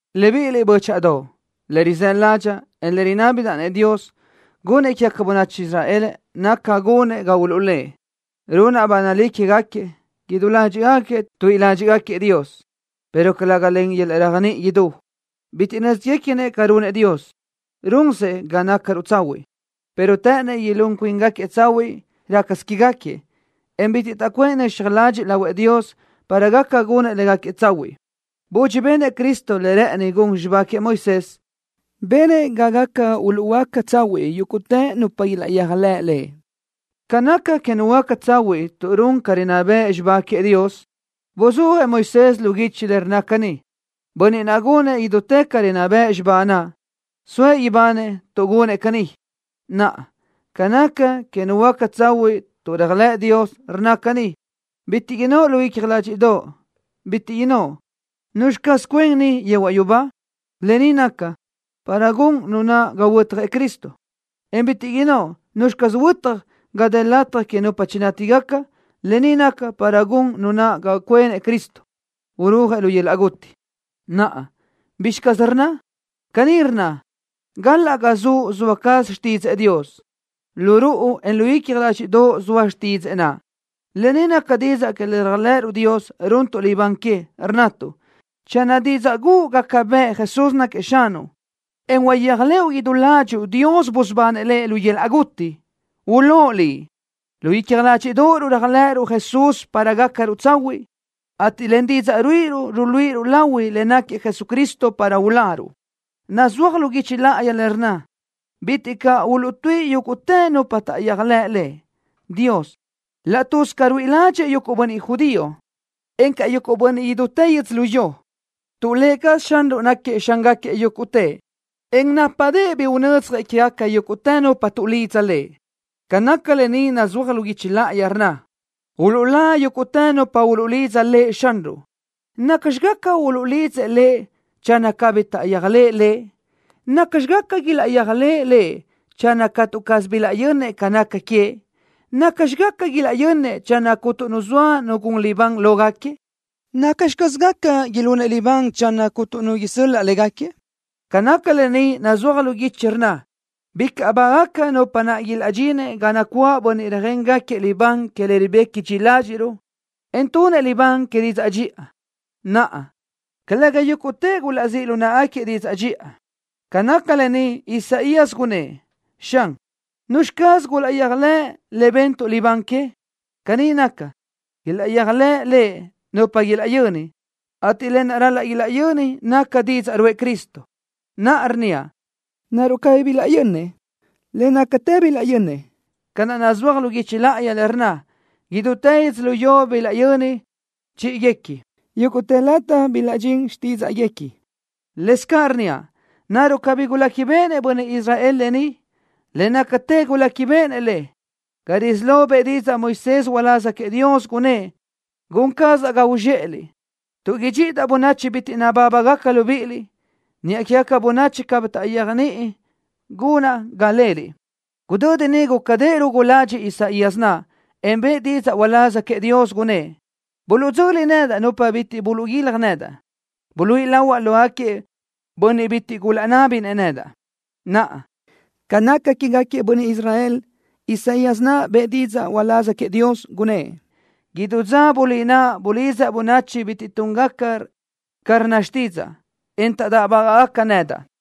Libíʼiliʼ, bö́chaʼadoʼ, le rizë́ ládxaʼa, en le rinábidaʼ-nëʼ Dios gunëʼ quégaca bönachi Israel naca gunëʼ ga uluʼlë́ʼ. Runaʼ ba nalí quégaquiëʼ, idú ládxiʼgaquiëʼ tuíʼi ládxiʼgaquiëʼ Dios, pero calëga len yöl-laʼ réajniʼi idú. Bitiʼ nö́zguequinëʼ ca runëʼ Dios, runsëʼ ga nácaruʼ tsahuiʼ, pero të́ʼënnëʼ ilún cuíngaquiëʼ tsahuiʼ rácasö quégaquiëʼ, en bitiʼ taʼcuʼë nöxaj ladxiʼ lahuëʼ Dios para gaca gunëʼ légaquiëʼ tsahuiʼ. Budxi benëʼ Cristo le rë́ʼëni gun xibá queëʼ Moisés, benëʼ ga gaca uluʼhuöáca tsahuiʼ yúguʼtë nupa ilaʼyéajlëʼ Lëʼ. Ca naca que nu huöáca tsahuiʼ tuʼ run ca rinná bëʼ xibá queëʼ Dios, buzúajëʼ Moisés lu guichi le rnna caní: “Bönniʼ naʼ gunëʼ idútë ca rinná bëʼ xibá naʼ, soëʼ ibanëʼ tuʼ gunëʼ caní.” Naʼa, ca naca que nu huöáca tsahuiʼ tuʼ réajlëʼ Dios, rnna caní: “Bitiʼ innóʼ lu icja ládxiʼdoʼo, bitiʼ innóʼ: ¿Nuzxi caz cuen niʼ yehuaʼ yubá?” Lë ni naca, para gun nu naʼ ga huötjëʼ Cristo, en bitiʼ innóʼ: “¿Nuzxi caz huötaj ga dë lataj que nupa chinátigaca?” Lë ni naca, para gun nu naʼ ga cuenëʼ Cristo, urúajëʼ lu yöl-laʼ guti. Naʼa, ¿bizxi caz rnna? Caní rnna: “Galaʼ ga zuʼ zoa caz xtídzëʼë Dios. Lu ruʼu, en lu icja ládxiʼdoʼo zoa xtídzëʼë naʼ.” Lë ni naca didzaʼ que le réajlëʼëruʼ Dios runtuʼ libán que, rnnatuʼ: “Channö didzaʼ guʼu gaca bëʼ Jesús náquiëʼ Xanuʼ, en uyéaj lëʼu idú ládxuʼu Dios busubanëʼ Lëʼ lu yöl-laʼ guti, ulóʼ liʼ.” Lu icja ládxiʼdoʼoruʼ réajlëʼëruʼ Jesús para gácaruʼ tsahuiʼ, ateʼ len didzaʼ ruíʼiruʼ, ruluíʼiruʼ lahui le náquiëʼ Jesucristo para uláruʼ. Nazúaj lu guichi láʼayi le rnna: “Bitiʼ caʼ uluʼtuíʼi yúguʼtë nupa taʼyéajlëʼ Lëʼ.” Dios, laʼ tuz ca ruíʼi ládxëʼë yuguʼ bönniʼ judío, encaʼ yuguʼ bönniʼ idútë yödzölió, tuʼ Lë cazëʼ Xanruʼ náquiëʼ Xángaquiëʼ yúguʼtëʼ, en nápadëʼë bi unödzjëʼ quégaca yúguʼtë nupa tuʼlidza Lëʼ. Ca naca lë ni nazúaj lu guichi láʼayi, rnna: “Uluʼlá yúguʼtë nupa uluʼlidza Lëʼ Xanruʼ.” ¿Nacxi gaca uluʼlidzëʼ Lëʼ channö cabí taʼyéajlëʼë Lëʼ? ¿Nacxi gaca ilaʼyéajlëʼë Lëʼ channö catu caz bilaʼyönnëʼ ca naca queëʼ? ¿Nacxi gaca ilaʼyönnëʼ channö cuntu nu zoa nu gun libán lógaquiëʼ? ¿Nacxi caz gaca ilunëʼ libán channö cuntu nu isöl-laʼ légaquiëʼ? Ca naca lë ni nazúaj lu guichi, rnna: “Bicaʼ bágaca nupa naʼ ilaʼdxinëʼ ga nacuáʼ bönniʼ röjéngaquiëʼ libán que le ribequi dxi ládxiʼruʼ, en tunëʼ libán que didzaʼ dxiʼa.” Naʼa, calëga yúguʼtëʼ gulaʼzíʼ lu náʼagaquiëʼ didzaʼ dxiʼa. Ca naca lë ni, Isaías gunnë́ʼ: “Xan, ¿nuzxi caz guyéajlëʼ le bentuʼ libán que?” Caní naca, ilaʼyéajlëʼ Lëʼ nupa ilaʼyöni, ateʼ lë naʼ ral-laʼ ilaʼyöni naca didzaʼ ruʼë Cristo. Naʼa rnníaʼ: ¿Naruʼ cabí bilaʼyönnëʼ? Le nácatë bilaʼyönnëʼ, ca naʼ nazúaj lu guichi láʼayi, le rnna: Idútë yödzölió bilaʼyöni chíʼiguequi. Yúguʼtë lataj bilaʼdxín xtídzaʼguequi. Lëscaʼ rnníaʼ: ¿Naruʼ cabí guléquibeʼenëʼ bönniʼ Israel lë ni? Le nácatë guléquibeʼenëʼ le. Ga risí lo, bëʼë didzaʼ Moisés uláz queëʼ Dios, gunnë́ʼ: Gun cazaʼ ga uzxéʼeliʼ, tuʼ idxíʼidaʼ bönachi bitiʼ nabábagaca libíʼiliʼ. Niʼa quégaca bönachi cabí taʼyéajniʼi gunaʼ ga leliʼ. Gudödi niʼ gúcadëʼë rugu ladxiʼ Isaías naʼ, en bëʼë didzaʼ uláz queëʼ Dios, gunnë́ʼ: Bilaʼdzöli nedaʼ nupa bitiʼ gulaʼguílaj nedaʼ. Buluíʼi lahuaʼ lógaquiëʼ bönniʼ bitiʼ bi gulaʼnábinëʼ nedaʼ. Naʼa, ca naca quégaquiëʼ bönniʼ Israel, Isaías naʼ bëʼë didzaʼ uláz queëʼ Dios, gunnë́ʼ: “Idú dza bulí naʼa, bulidzaʼ bönachi bitiʼ túngaca ca rnna xtídzaʼa, en taʼdáʼbagaʼ nedaʼ.”